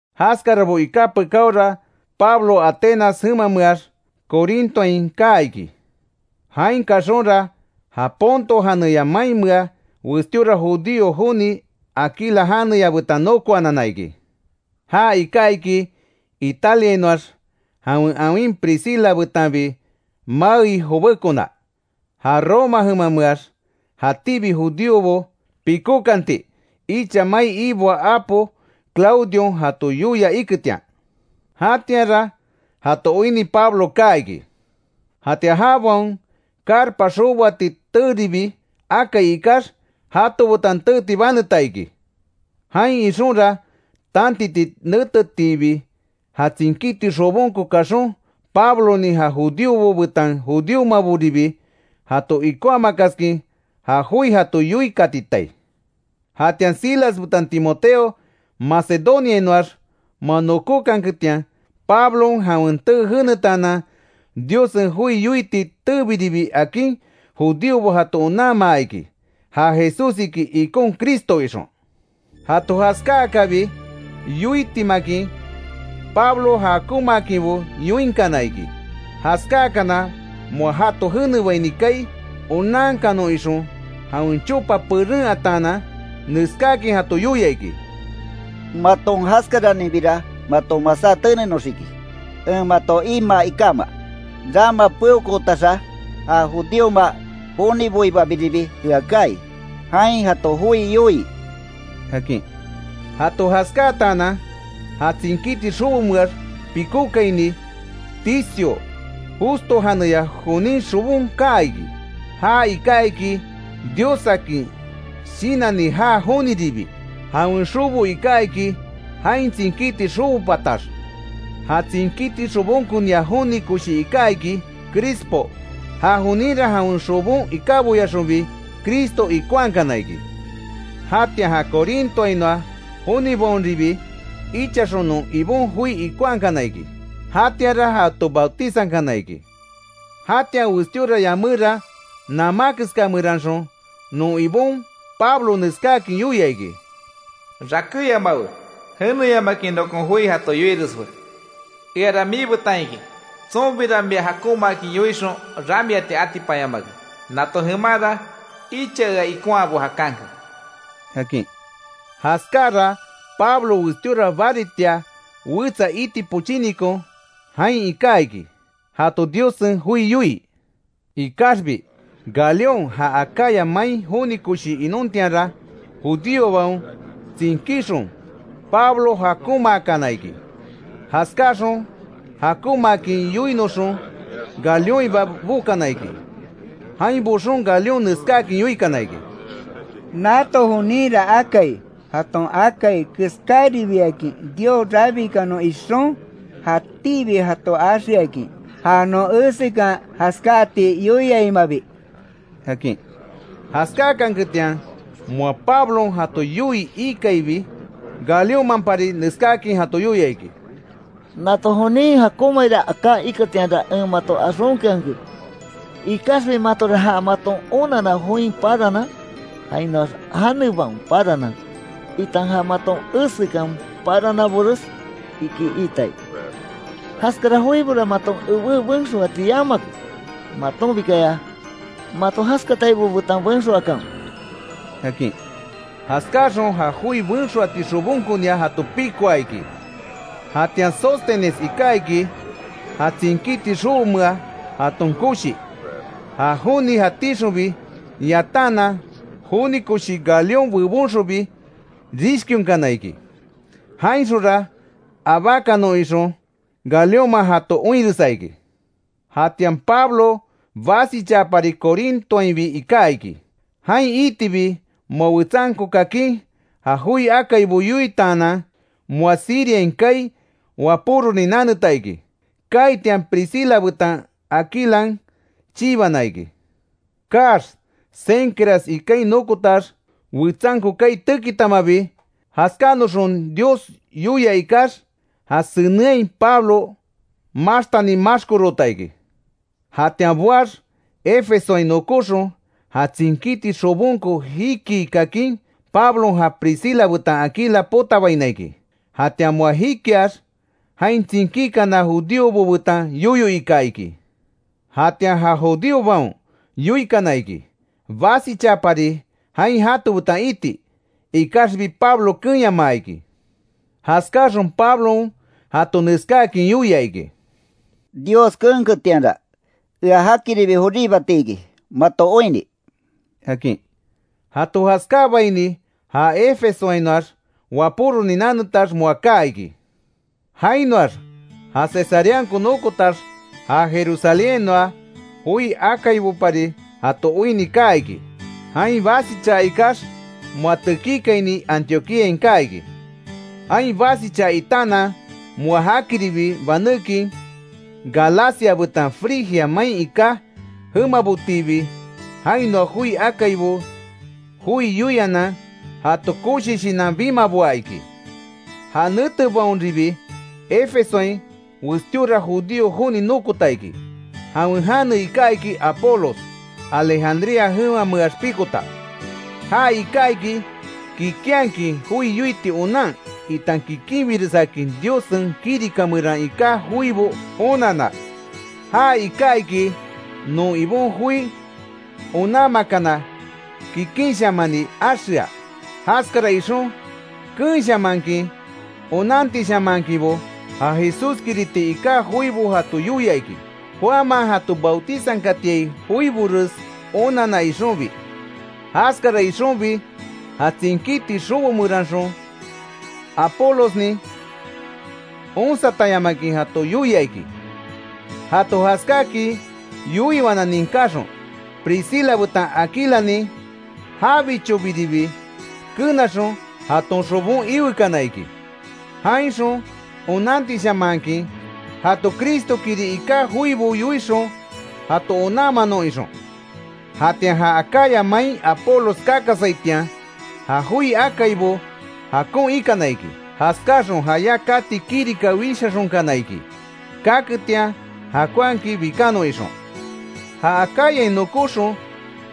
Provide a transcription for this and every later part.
Jaskarabo iká pekáora Pablo Atenas jemameax Corintoain kaa iki. Jain kaxonra, ja Ponto janeya mainmea westíora judío joni Aquila janeya betan nokoanana iki. Ja iká iki, Italiainoax jawen awin Priscila betanbi maei jobekona, ja Roma jemameax jatíbi judíobo pikókanti, icha mai iboaa apo Claudion jato yoia iketian. Jatianra jato oinni Pablo kaa iki. Jatian jabaon carpa xoboati teeribi akai ikax, jato betan teeti baneta iki. Jain ixonra, tantiti netetiibi ja tsinkíti xobonko kaxon, Pablonin ja judíobo betan judíomaboribi jato ikonhamakaskin ja joi jato yoikatitai. Jatian Silas betan Timoteo Macedoniainoax moa nokókanketian, Pablon jawen tee jenetaanan, Diossen joi yoiti teebiribi akin, judíobo jato onanmaa iki, ja Jesús iki ikon Cristo ixon. Jato jaskáakabi yoitimakin Pablo jakonmaakinbo yoinkana iki. Jaskáakana moa jato jenebaini kaai onankanon ixon, jawen chopa peren ataanan neskáakin jato yoia iki: —Maton jaskaraninbira maton masá tenenoxiki, en mato imaa ikama. Rama peokootaxa ja judíoma joniboibabiribi ea kaai, jain jato joi yoii —akin. Jato jaskátaanan, ja tsinkíti xobomeax pikókaini, Ticio Justo janeya jonin xobon kaa iki. Ja iká iki Diossakin shinanni jaa joniribi; jawen xobo iká iki jain tsinkíti xobo patax. Ja tsinkíti xobonkonia joni koshi iká iki Crispo. Ja joninra jawen xobon ikáboyaxonbi Cristo ikonhakana iki. Jatian ja Corintoainoa jonibaonribi ichaxon non Ibon joi ikonhakana iki. Jatianra jato bautizankana iki. Jatian westíora yaméra, namá keska meranxon non Ibon, Pablo neskáakin yoia iki: “Rakéyamawe, jeneyamakin nokon joi jato yoireswe. Eara miibetan iki, tsonbira mia jakonmaakin yoixon ramiati atipanyamake. Nato jemanra icha ea ikonhaabo jakanke”, akin. Jaskáara Pablo westíora baritia wetsa iti pochínikon jain iká iki, jato Diossen joi yoii. Ikaxbi Galión ja Acaya main joni koshi inontianra, judíobaon tsinkíxon Pablo jakonmaakana iki. Jaskáxon jakonmaakin yoinoxon Galiónhiba bokana iki. Jain boxon Galión neskáakin yoikana iki: —Nato joninra akai, jaton akai keskáribiakin Dios rabikanon ixon, jatíbi jato axeakin, ja non esekan jaskáati yoiaimabi —akin. Jaskákanketian moa Pablon jato yoii ikaibi, Galiónmanpari neskáakin jato yoia iki: —Nato jonin jakonmaira aká iketianra en mato axonkeanke. Ikaxbi matora ja maton onanna join paranan, jainoax janebaon paranan, itan ja maton esekan parananbores, ikí iitai. Jaskara joibora maton ebé benxoati yamake. Matonbikaya, mato jaskataibo betan benxoakanwe —akin. Jaskáaxon ja joi benxoati xobonkonia jato pikoa iki. Jatian Sóstenes iká iki ja tsinkíti xobomea jaton koshi. Ja joni jatíxonbi yataanan, joni koshi Galión bebonxonbi rishkionkana iki. Jainxonra abákanon ixon Galiónman jato oinresa iki. Jatian Pablo basichaapari, Corintoainbi iká iki. Jain iitibi moa wetsanko kakin, ja joi akaibo yoitaanan, moa Siriain kaai wapóronin naneta iki. Kaitian Priscila betan Aquilan chibana iki. Kaax Cencreas ikain nokotax, wetsanko kaai tekitamabi, jaskánoxon Dios yoia ikax, ja senenhai Pablo maxtani maxkoroota iki. Jatian boax, Efesoain nokóxon, ja tsinkíti xobonko jikii kakin, Pablon ja Priscila betan Aquila potabaina iki. Jatian moa jikiax, jain tsinkíkana judíobo betan yoyo ika iki. Jatian ja judíobaon yoikana iki, basichaapari jain jato betan iti, ikaxbi Pablo keenyamaa iki. Jaskáxon Pablon jato neskáakin yoia iki: “Dios keenketianra, ea jakiribi joríbati iki mato oinni”, akin. Jato jaskáabaini ja Efesoainoax wapóronin nanetax moa kaa iki. Jainoax ja Cesareanko nokotax, ja Jerusalénhainoa joi akaibopari jato oinni kaa iki. Jain basichaa ikax, moa tekíkaini Antioquíain kaa iki. Jain basichaa itaanan, moa jakiribi banékin, Galacia betan Frigia main iká jemabotiibi jainoa joi akaibo joi yoianan jato koshi shinan bimaboa iki. Ja netebaonribi Efesoain westíora judío joni nokota iki. Jawen jane iká iki Apolos, Alejandría jemameax pikota. Ja iká iki, kikinhakin joi yoiti onan itan kikinbiresakin Diossen kirika meran iká joibo onanna. Já iká iki, non Ibon joi onanmakana kikinshamani axea. Jaskara ixon keenshamankin, onantishamanhakinbo ja Jesúskiriti iká joibo jato yoia iki. Juanman jato bautizankatiai joibores onanna ixonbi. Jaskara ixonbi, ja tsinkíti xobo meranxon Apolosnin, onsatanyamakin jato yoia iki. Jato jaskáakin yoiwana ninkáxon, Priscila betan Aquilanin jabichobiribi kenaxon, jaton xobon iwekana iki; jainxon onantishamanhakin jato Cristo kiri iká joibo yoixon jato onanmanon ixon. Jatian ja Acaya main Apolos kakasaitian, ja joi akaibo jakon ikana iki. Jaskaxon jayá kati kirika wishaxonkana iki, kaketian jakonhakin bikanon ixon. Ja Acayain nokóxon,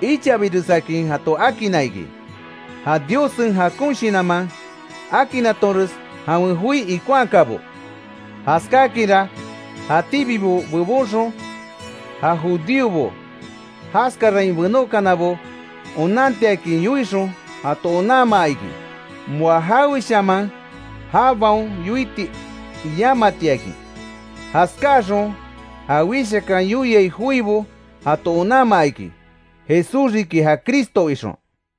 ichabiresakin jato akinna iki, ja Diossen jakon shinanman akinatonres jawen joi ikonhakabo. Jaskákinra, jatíbibo bebonxon ja judíobo, jaskarain benókanabo, onantiakin yoixon jato onanmaa iki, moa jaweshaman jabaon yoiti yamatiakin. Jaskáaxon ja wishakan yoiai joibo jato onanmaa iki, Jesús riki ja Cristo ixon.